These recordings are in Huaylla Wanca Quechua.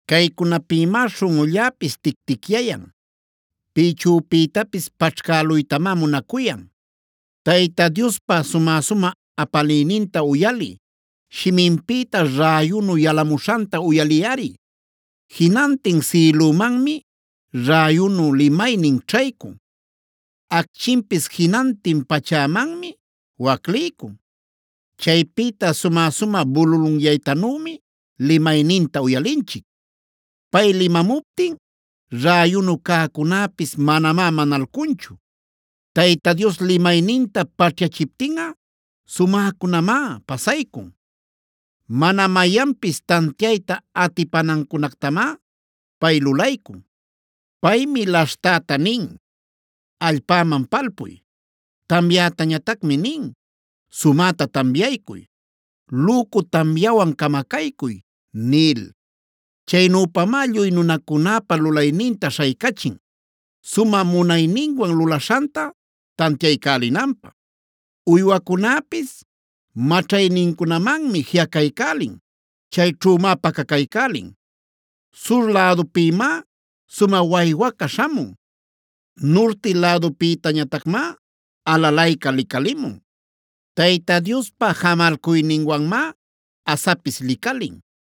“Caycunapïmá śhunꞌulläpis ticticyayan, pïchüpïtapis paćhcäluytamá munacuyan. Tayta Diospa sumä-sumä apaliyninta uyaliy; shiminpïta räyunu yalamuśhanta uyaliyꞌari. Jinantin sïlümanmi räyunu limaynin ćhaycun; acchinpis jinantin pachämanmi wacliycun. Chaypïta sumä-sumä bululunyaytanümi limayninta uyalinchic; pay limamuptin räyunu cäcunäpis manamá manalcunchu. Tayta Dios limayninta paćhyachiptinꞌa sumäcunamá pasaycun; mana mayanpis tantiayta atipanancunactamá pay lulaycun. “Paymi laśhtäta nin: ‘Allpäman palpuy’; tamyätañatacmi nin: ‘Sumäta tamyaycuy, lücu tamyawan camacaycuy’ nil. Chaynüpamá lluy nunacunäpa lulayninta śhaycachin, sumä munayninwan lulaśhanta tantiaycälinanpä. Uywacunäpis maćhaynincunamanmi jiꞌacaycälin; chayćhümá pacacaycälin. Sur lädupïmá sumä waywaca śhamun; nurti lädupïñatacmá alalayca licalimun. Tayta Diospa jamalcuyninwanmá asapis licalin,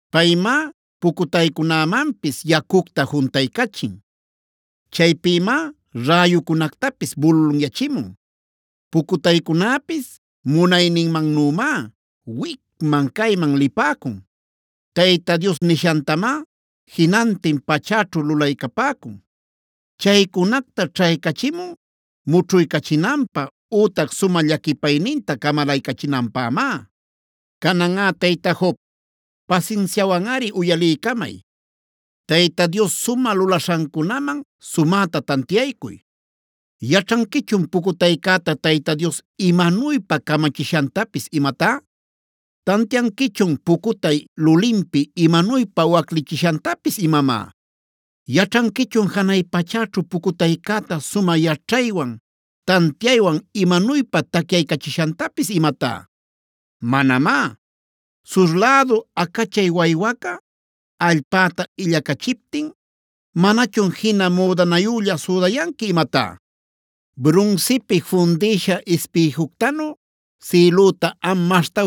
Paymá pucutaycünämanpis yacucta juntaycachin; chaypïmá räyucunactapis bululanyachimun. Pucutaycunäpis munayninmannümá wicman-cayman lipäcun. Tayta Dios nishantamá jinantin pachäćhu lulaycapäcun. Chaycunacta ćhaycachimun mućhuycachinanpä ütac sumä llaquipayninta camalaycachinanpämá. “Cananꞌa tayta Job, pasinsiawanꞌari uyaliycamay; Tayta Dios sumä lulaśhancunaman sumäta tantiaycuy. ¿Yaćhanquichun pucutaycäta Tayta Dios imanuypa camachishantapis imatá? ¿Tantianquichun pucutay lulinpi imanuypa waclichishantapis imamá? ¿Yaćhanquichun janay pachäćhu pucutaycäta sumä yaćhaywan tantiaywan imanuypa tacyaycachishantapis imatá? Manamá. ¿Sur lädu acachay waywaca allpäta illacachiptin manachun jina müdanayülla südayanqui imatá? ¿Brunsipi fundïsha ispïjuctanu sïlüta am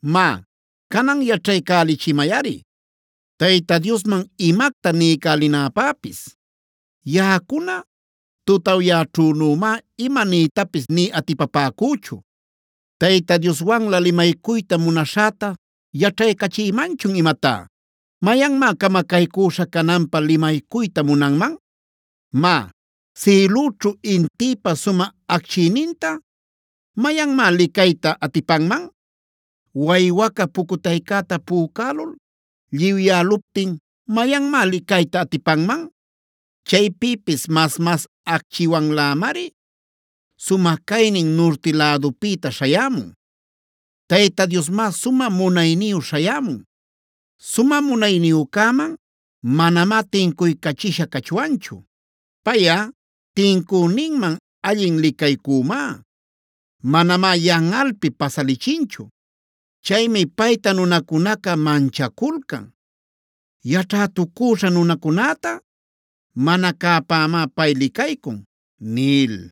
“Má, canan yaćhaycälichimayꞌari Tayta Diosman imacta niycälinäpäpis; yaꞌacuna tutawyayćhünümá ima niytapis nï atipapäcüchu. ¿Tayta Dioswanlä limaycuyta munaśhäta yaćhaycachïmanchun imatá? ¿Mayanmá camacaycüśha cananpä limaycuyta munanman? Má, sïlüćhu intïpa sumä acchiyninta, ¿mayanmá licayta atipanman? Waywaca pucutaycäta pücälul lliwyäluptin, ¿mayanmá licayta atipanman? Chaypïpis mas-mas acchiwanlämari sumä caynin nurti lädupïta śhayämun. Tayta Diosmá sumä munayniyu śhayämun. Sumä munayniyücäman manamá tincuycachisha cachwanchu. Payꞌa tincüninman allin licaycümá; manamá yanꞌalpi pasalichinchu. Chaymi payta nunacunaca manchaculcan. Yaćhätucüśha nunacunäta mana cäpämá pay licaycun” nil.